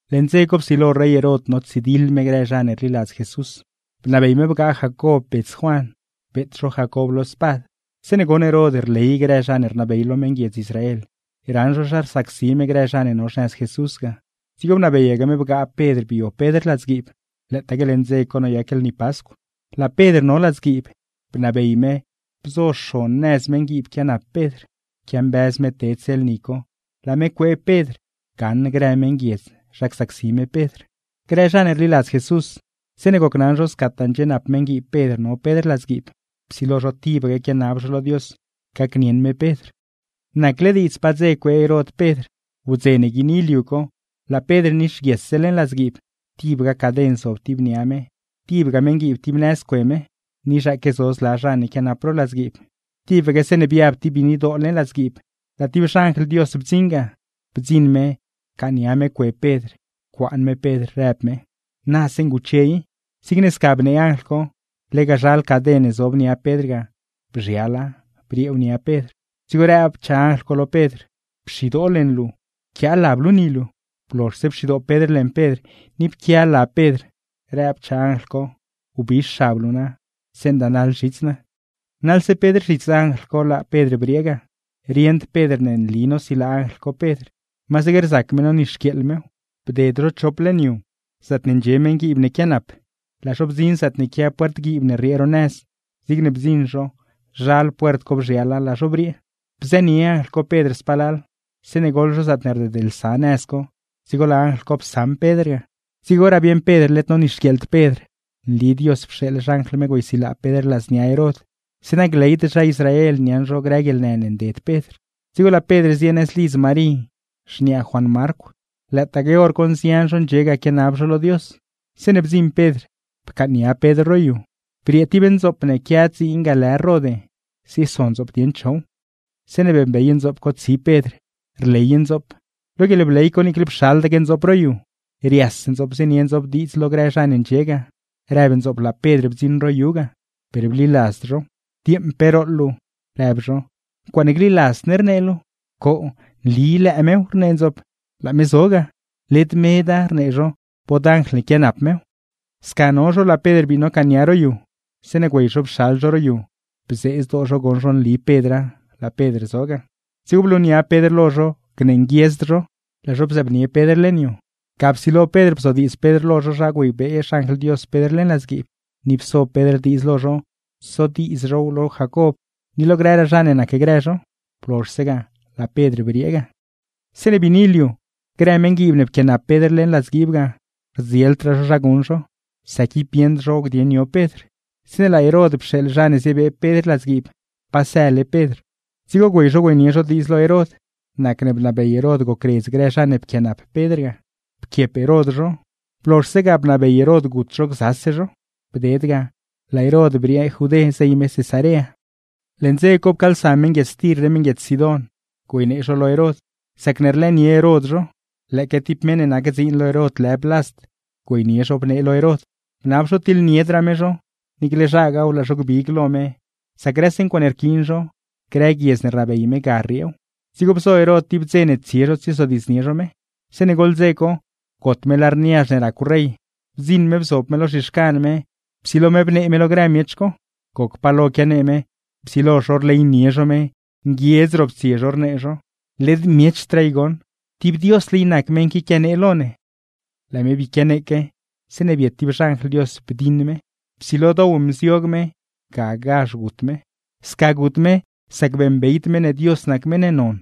Leṉ dze co psilo rey Herod notsidiḻ me grë zha ne rliladz Jesús. Bnabey me bgaa Jacob bets Juan, beet zho Jacob lo spad. Zeeṉe goṉ Herod rley grë zha ne rnabey lo meṉguiedz Israel raṉ zho zha rsacsi me grë zha ne no xnëz Jesús ga, dzigo bnabeyaque me bgaa Pedr bio Pedr ladzguiib; lëëtaque leṉ dze co noyac lni Pascw. Laa Pedr no ladzguiib, bnabey me bzo xon nëz meṉguiib quianap Pedr. Quiambëz me tedse lni co, laa me cuee Pedr gaṉ grë meṉguiedz zha csacsi me Pedr. Grë zha ne rliladz Jesús, zeeṉe gocnaṉ zho scataa ndxienap meṉguiib Pedr no Pedr ladzguiib, psilo zho tibaque quianab zho lo Dios gacnieṉ me Pedr. Nacle diidz pa dze cuee Herod Pedr. Wdze ne guiini liu co, laa Pedr nixguiesse leṉ ladzguiib; tib ga caden zob ti nia me, tibga meṉguiib tib nëz cue me, ni zhaaque zo zla zha ne quianap ro ladzguiib. Tibaque zeeṉe biab ti biinidoo leṉ ladzguiib, laa ti xanjl Dios bdziṉ ga. Bdziṉ me, pcaaṉnia me cue Pedr, pcuaan me Pedr, rëb me: ―¡Na zeeṉ guche i! Zigne sca bnee anjl co, lega zhal caden ne zob nia Pedr ga bzhiala brieew nia Pedr; dzigo rëbchaa anjl co lo Pedr: ―¡Pxidoo leṉ luu, pquiaa lab luu ni luu! Blozhse pxidoo Pedr leṉ Pedr, ni pquia lab Pedr; rëbchaa anjl co: ―¡Wbix xab luu na, zeeṉ dënaḻ zhits naa! Naḻse Pedr zhits anjl co laa Pedr briee ga. Rieṉd Pedr ne nli nosilaa anjl co Pedr, masaque rzac me nonixquieeḻ mew. Bded zho chop leṉ yu zaatne ndxie meṉguiib ne quianap, laa zho bdziṉ zaatne quia puert guiib ne rriee ro nëz. Zigne bdziṉ zho, zhal puert co bzhiala; laa zho briee. Bzënie anjl co Pedr spalal, zeeṉe goḻ zho zaatne rdedlsa nëz co, dzigo laa anjl co psaṉ Pedr ga. Dzigoraa bieṉ Pedr led nonixquieeḻd Pedr, nli Dios pxeeḻ xanjl me güeysilaa Pedr ladznia Herod, zeeṉa gleyd zha Israel niaṉ zho grë guieḻnë ne nded Pedr. Dzigo laa Pedr zie nëz lidz Marí, xniaa Juan Marcw; lëëtaque hor co nzian zho ndxie ga quianab zho lo Dios. Zeeṉe bdziṉ Pedr pcaaṉnia Pedr ro yu. Briee ti ndzoop ne quia dziin ga lë Rode, zieso ndzoop dieṉ chow. Zeeṉe beeṉbey ndzoop co tsi Pedr, rley ndzoop. Lo guieḻbley co niicle pxaldaque ndzoop ro yu, rias ndzoop zienie ndzoop diidz lo grë zha ne ndxie ga; rëb ndzoop laa Pedr bdziṉ ro yu ga. Per bliladzd zhow. ―¡Dieeṉ pe rooḻ luu! ―rëb zho―. ¡Ncuaaṉe gliladzd ne rnee luu! ―¡Coo, nli lëë mew! ―rnee ndzoop―, laa me zo ga. ―¡Led meda, ―rnee zho―, bod anjl ne quianap mew! Sca no zho, laa Pedr bii nocaaṉnia ro yu. Zeeṉe güey zho pxal zho ro yu, bzee zdoo zho goṉ zho nli Pedra, laa Pedr zo ga. Dzigo blunia Pedr lo zho gnee nguiedzd zho; laa zho bzëëbnie Pedr leṉ yu. Ga psilo Pedr bzodiidz Pedr lo zho zha güeybee xanjl Dios Pedr leṉ ladzguiib; ni pso Pedr diidz lo zho sodiidz zhow lo Jacob, ni lo grëraa zha ne nacgrë zho. Blozhse ga, laa Pedr briee ga. Zeeṉe biini liu, grë meṉguiib ne pquianap Pedr leṉ ladzguiib ga, rdzieldraa zho zha guṉ zho; sac ib bieṉd zho dieṉ yo Pedr. Zeeṉe laa Herod pxeeḻ zha ne ziebee Pedr ladzguiib, pa sële Pedr. Dzigo güey zho güeynie zho diidz lo Herod; nacne bnabey Herod gocredz grë zha ne pquianap Pedr ga, pquiep Herod zho; blozhse ga, bnabey Herod gut zho gzase zho. Bded ga, laa Herod briee Judé zey me Cesarea. Leṉ dze co, pcaalsa meṉguiedz Tir ni meṉguiedz Sidón güeynee zho lo Herod; sacne rlëënie Herod zho. Lëëque ti meṉ ne nac dziin lo Herod lë Blast güeynie zho bnee lo Herod, bnab zho tiḻniedraa me zho, niicle zhagaaw laa zho gbig lo me; sac grëse ncuaaṉe rquiin zho, grë guiedz ne rnabey me ga rrieew. Dzigo bzo Herod ti dze ne tsie zho tsiezodiidznie zho me. Zeeṉe goḻ dze co, got me lar niazh ne racw rey; bdziṉ me bzob me lo zhixcan me, psilo me bnee me lo grë miech co. Goc palo quianee me, psilo zho rleynie zho me, nguiedz roptsie zho rnee zho: ―¡Led miechdraa i goṉ! ¡Ti diosle i nac meṉ qui quianee lo ne! Laa me bii quianeeque, zeeṉe biet tib xanjl Dios bdiṉ me, psilo dow mziog me, gagazh gut me. Sca gut me, sac beeṉbeyd me ne Dios nac meṉ ne non,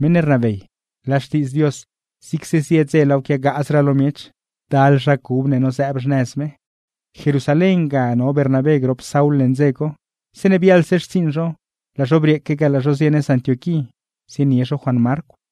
meṉ ne rnabey. Laa Xtiidz Dios, zigse zie dze laaw quiagaazraa lo miech; ndal zha cub ne nozëëb xnëz me. Jerusalén ga no Bernabé grop Saul leṉ dze co; zeeṉe biaḻse xtsiiṉ zho, laa zho brieeque ga laa zho zie nëz Antioquí zienie zho Juan Marcw.